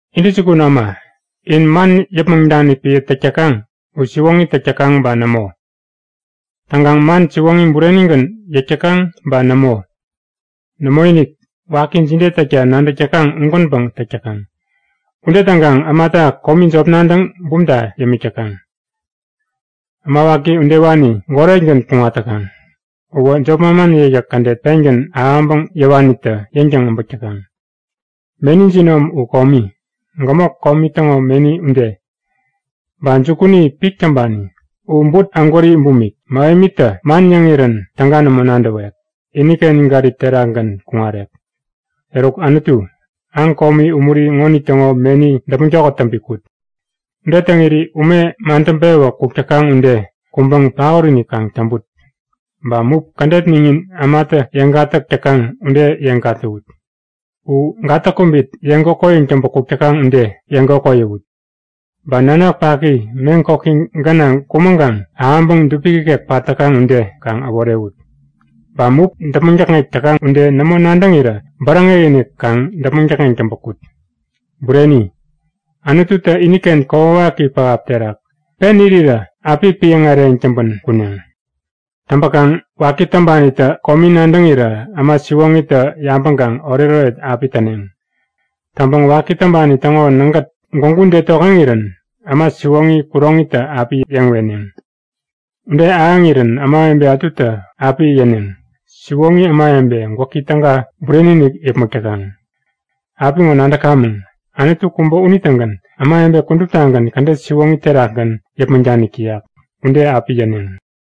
Intäjukun äma, in man yäpmäŋ danik piä täk täkaŋ u siwoŋi täk täkaŋ ba nämo? Täŋkaŋ man siwoŋi burenigän yäk täkaŋ ba nämo? Nämoinik! Waki jide täkta nadäk täkaŋ ugänpäŋ täk täkaŋ. Ude täŋkaŋ ämata komi jop nadäŋ bumta yämik täkaŋ. Äma waki udewani goretgän kuŋat täkaŋ. Uwä jop manman yäkyäk kädet pengän ahäŋpäŋ yäwanitä yäŋtäŋ äbäk täkaŋ. Meni jinom u komi, gämok komi täŋo meni ude. Ba jukuni pik täŋpani. U but ägwäri bumik. Mähemitä man yäŋirän täga nämo nadäwek. Iniken gärip terakgän kuŋarek. Eruk Anutu, aŋ komi umuri ŋonitäŋo meni däpmäŋ tokät täŋpi kut. Ude täŋiri ume madäŋpewä kuk täkaŋ ude kuŋpäŋ paot-inik kaŋ täŋput. Ba mup kädet miŋin ämatä yeŋ gatäk täkaŋ ude yeŋ gatäwut. U gatäk-kubit yeŋ kokoyäŋ täŋpä kuk täkaŋ ude yeŋ kokoyäwut. Ba nanak paki meŋ koki gänaŋ kumäŋkaŋ ahäŋpäŋ dupik ikek pat täkaŋ ude kaŋ äworewut. Ba mup däpmäŋ täkŋek täkaŋ ude nämo nadäŋirä bäräŋek-inik kaŋ däpmäŋ täkŋeŋ täŋpä kut. Bureni, Anututä iniken kokwawaki pähap terak pen irirä api piäŋ äreyäŋ täŋpän kuneŋ. Täŋpäkaŋ waki täŋpanitä komi nadäŋirä äma siwoŋitä yabäŋkaŋ oretoret api täneŋ. Täŋpäŋ waki täŋpani täŋo nägät gwägu ude tokŋeŋirän äma siwoŋi kuroŋitä api yeŋ weneŋ. Ude ahäŋirän ämawebe ätutä api yäneŋ; Siwoŋi ämawebe gwäki täga bureni-inik yäpmäk täkaŋ. Apiŋo nadäkamäŋ; Anutu kubä unitägän ämawebe kuduptagän kädet siwoŋi terakgän yäpmäŋ danik täyak. Ude api yäneŋ.